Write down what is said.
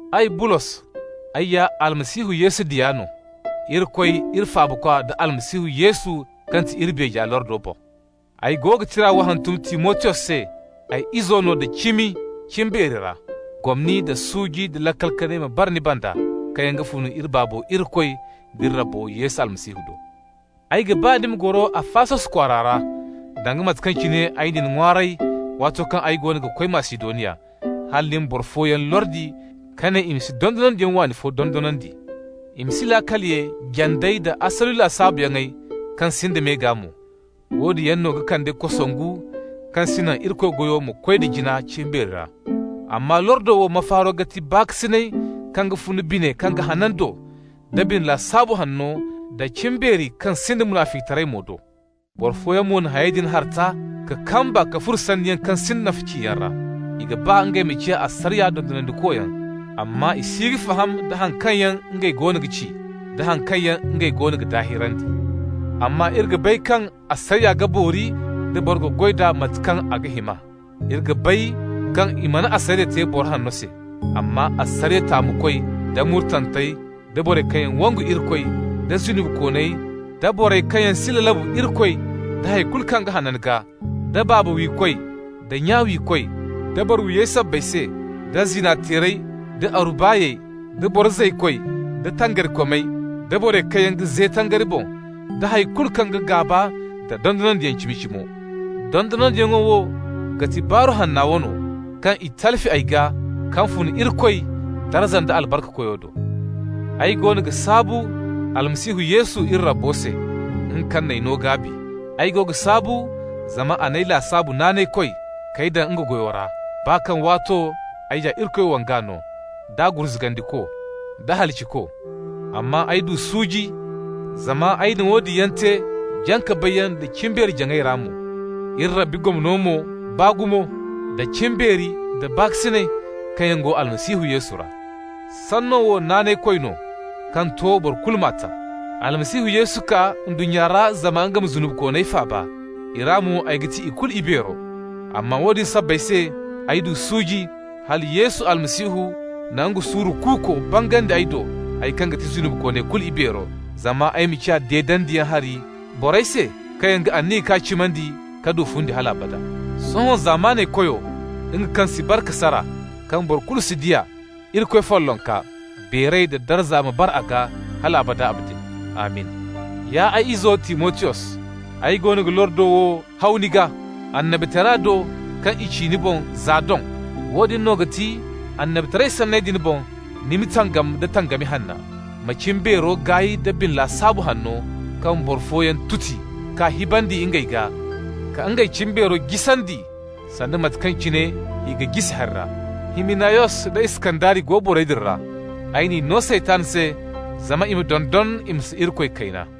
Ay, Bulos, ay ya Almasihu Yesu diya no, Irikoy iri Faabakwa da Almasihu Yesu kaŋ ti iri beeja lordo boŋ. Ay go ga tira wo hantum Timotiyos se, ay ize no da cimi cimbeeri ra. Gomni nda suuji nda laakal kanay ma bara ni banda kaŋ yaŋ ga fun iri Baabo Irikoy d'iri Rabbo Yesu Almasihu do. Ay ga ba ni ma goro Afasos kwaara ra, danga mate kaŋ cine ay na ni ŋwaaray waato kaŋ ay goono ga koy Masidoniya, hala ni ma boro fooyaŋ lordi ka ne i ma si dondonandiyaŋ waani fo dondonandi. I ma si laakal ye jandey da asuli lasaabuyaŋ kaŋ sinda me gaa mo. Woodin yaŋ no ga kande kosongu kaŋ si naŋ Irikoy goyo ma koy da jina cimbeeri ra. Amma lordo wo mafaaro ga ti baakasinay kaŋ ga fun bine kaŋ ga hanan do da bine lasaabu hanno nda cimbeeri kaŋ sinda munaficitaray mo do. Boro fooyaŋ mo na hayey din harta ka kamba ka furo sanniyaŋ kaŋ sinda nafa ciyaŋ ra. I ga ba ngey ma ciya asariya dondonandikoyaŋ, amma i si ga faham da haŋ kaŋ yaŋ ngey goono ga ci, da haŋ kaŋ yaŋ ngey goono ga daahirandi. Amma iri ga bay kaŋ asariya ga boori da boro ga goy d'a mate kaŋ a ga hima. Iri ga bay kaŋ i mana asariya te boro hanno se, amma asariya taamukoy, da murtantey, da borey kaŋ yaŋ wangu Irikoy, da zunubikooney, da borey kaŋ yaŋ si lalabu Irikoy da hay kulu kaŋ ga hanan gaa, da baaba wiikoy da nya wiikoy, da boro-wiyey sabbay se, da zina-teerey, da aru-baay, da boro zaykoy, da tangarikomey, da borey kaŋ yaŋ ga ze tangari boŋ, da hay kulu kaŋ ga gaaba nda dondonandiyaŋ cimi-cimo. Dondonandiyaŋo wo ga ti Baaru Hanna wano, kaŋ i talfi ay gaa, kaŋ fun Irikoy darza nda albarka Koyo do. Ay goono ga saabu Almasihu Yesu iri Rabbo se, nga kaŋ n'ay no gaabi. Ay go ga saabu zama a n'ay lasaabu naanaykoy k'ay daŋ nga goyo ra, baa kaŋ waato ay ya Irikoy wanga no, da gurzugandiko, da halaciko. Amma ay du suuji zama ay na woodin yaŋ te jaŋ-ka-bayyaŋ da cimbeeri-jaŋay ra mo. Iri Rabbi gomno mo baa gumo, da cimbeeri nda baakasinay kaŋ yaŋ go Almasihu Yesu ra. Sanno wo naanaykoy no kaŋ to boro kulu m'a ta: Almasihu Yesu kaa ndunnya ra zama nga ma zunubikooney faaba. I ra mo ay ga ti ikulu ibeero. Amma woodin sabbay se ay du suuji, hala Yesu Almasihu na nga suuru kuuko bangandi ay do, ay kaŋ ga ti zunubikooney kulu ibeero, zama ay ma ciya deedandiyaŋ hari borey se kaŋ yaŋ ga aniya k'a cimandi ka du fundi hal abada. Sohõ, zamaney Koyo, nga kaŋ si bare ka sara, kaŋ boro kulu si di a, Irikoy follonka, beeray da darza ma bara a gaa hal abada abadin. Amin! Ya ay izo Timotiyos, ay goono ga lordo wo haw ni gaa, annabitara do kaŋ i ci ni boŋ za doŋ. Woodin no ga ti, annabitaray sanney din boŋ, ni ma tangam da tangami hanna. Ma cimbeero gaay nda bine lasaabu hanno, kaŋ boro fooyaŋ tuti ka hibandi ngey gaa, ka ngey cimbeero jisandi, sanda mate kaŋ cine hi ga jisi hari ra. Himinayos da Iskandari go borey din ra. Ay n'i no Saytan se zama i ma dondon i ma si Irikoy kayna.